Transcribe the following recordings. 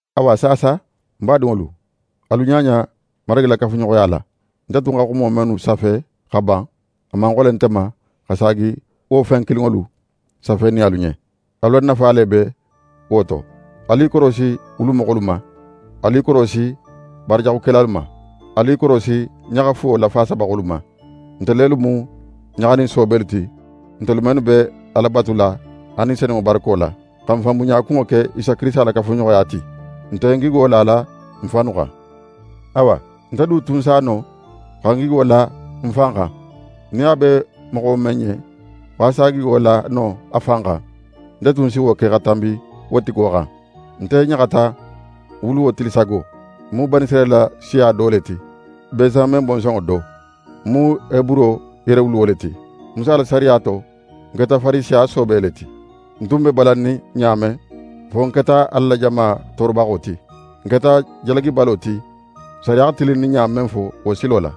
Awa saasa, ń badinŋolu, alu ɲaɲa Marigi la kafuɲoxoya la. Nte tun xa xumo mennu safe xa ban, a man xole nte ma xa saagi wo fen kilinŋolu safenin alu ɲen. Alu la nafa le be wo to. Alu i korosi wulumoxolu ma, alu i korosi baarajaxukelalu ma, alu i korosi ɲaxa fuwo lafaasabaxolu ma. Nte lelu mu ɲaxanin soobelu ti, ntelu mennu be Ala batula a Ni Senunŋo barako la, xa n fanbunɲa kunŋo ke Isa Kirisita la kafuɲoxoya ti. N nte n gigo lala n fannu xan. Awa, nte du tun s'a no xa ń gigo la ń fan xan. Nin a be moxo men ɲen xo a s'í gigo la no a fan xan, nte tun si wo ke xa tanbi wo tigo xan. Nte ɲaxata ń wuluwo tili sago. Ń mu Banisirayila siya do le ti, Bensamen bonsonŋo do. Ń mu Heburo yerewuluwo le ti. Musa la sariya to, nte keta Farisiya soobe le ti. Nte tun be balannin ɲa men, fo ń keta Ala la jama toorobaxo ti. Ń keta jalagibalo ti sariya xa tilinninɲa men fo wo silo la.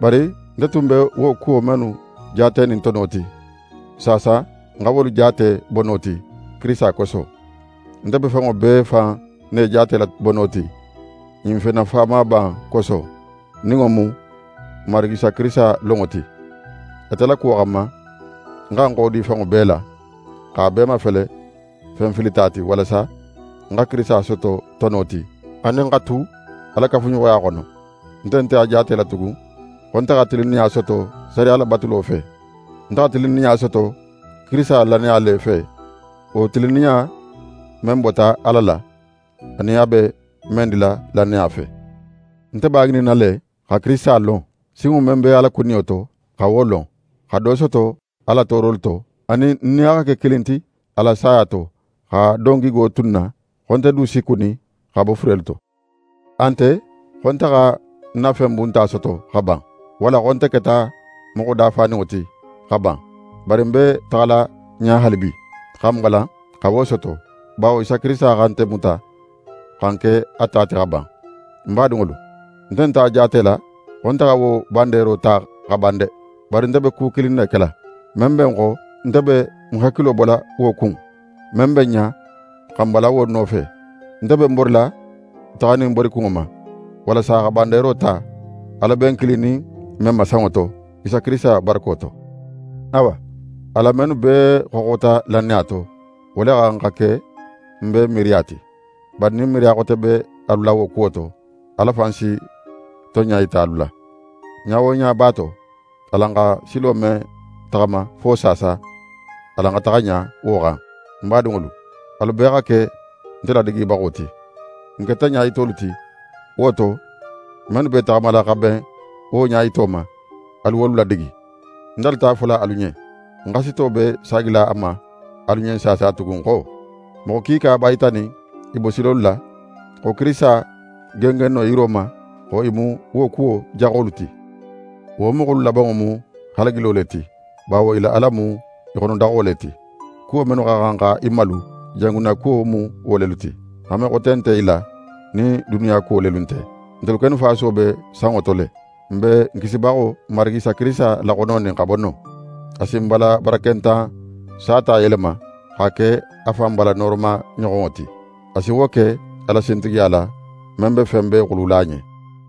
Bari nte tun be wo kuwo mennu jaatenin tono ti, saasa ń xa wolu jaate bono ti, Kirisita koso. Nte be fenŋo bee fan ne jaatela bono ti ɲin fen nafamaba in koso, nin wo mu ń Marigi Isa Kirisita lonŋo ti. Ate la kuwo xanma, ń xa ń xodi fenŋo bee la, x'a bee mafele fen filita ti, walasa ń xa Kirisita soto tono ti, anin ń xa tu a la kafuɲoxoya xono. Nte nte a jaatela tugun xo nte xa tilinninɲa soto sariya labatulo fe. Nte xa tilinninɲa soto Kirisita lannaya le fe, wo tilinninɲa men bota Ala la, anin a be men dila lannaya fe. Nte b'a ŋininna le, xa Kirisita lon, sinŋo men be a la kuniyo to, xa wo lon, xa do soto a la toorolu to, anin ń nin a xa ke kilin ti a la saya to, xa don gigo tu ń na xo nte du si kuni xa bo furelu to. A nte xo nte xa ń na fen bunta soto xa ban, walla xo nte keta moxo dafaninŋo ti xa ban. Bari ń be taxala ɲa haalibi, xa ń balan xa wo soto; bawo Isa Kirisita xa nte muta xa ń ke a ta ti xa ban. Ń badinŋolu, nte nt'a jaatela xo nte xa wo bandeero ta xa ban de! Bari nte be ku kilin ne kela: Men be ń xo, nte be ń hakilo bola wo kun, men be ń ɲa, xa ń balan wo nofe. Nte be ń borila taxanin ń borikunŋo ma, walasa xa bandeero ta, Ala be n kilinin men ma sanŋo to, Isa Kirisita barako to. Awa, alan mennu bee xoxota lannaya to, wo le xa xan xa ke n bee miiriya ti. Bari nin miiriya xote be alu la wo kuwo to, Ala fan si tonɲa yita alu la. Ɲa wo ɲa b'a to, alan xa silo men taxama fo saasa, alan xa taxa ɲa wo xan. Ń badinŋolu, alu bee xa ke nte ladigibaxo ti. N keta ɲayitolu ti, wo to, mennu b'e taxamala xa ben wo ɲayito ma, alu wolu ladigi. Ń dalita a fola alu ɲen, ń xasito be saagila a ma alu ɲen saasa tugun xo: Moxo kiika b'a yitanin i bosilolu la xo Kirisita gengenno yiro ma, xo i mu wo kuwo jaxolu ti. Wo moxolu labanŋo mu halagilo le ti, bawo i la ala mu i xonodaxo le ti. Kuwo mennu xa xan xa i malu, i jangunnakuwo mu wo lelu ti. Hanme xote nte i la nin duniya kuwo lelu nte. Ntelu kennu fasuwo be sanŋo to le. N be n Kisibaxo, Marigi Isa Kirisita laxononin xa bo non. A si n bala barakentan sata yelema, x'a ke a fan bala nooroma ɲoxonŋo ti. A si wo ke a la sintigiya la, men be fen bee xulula a ɲen.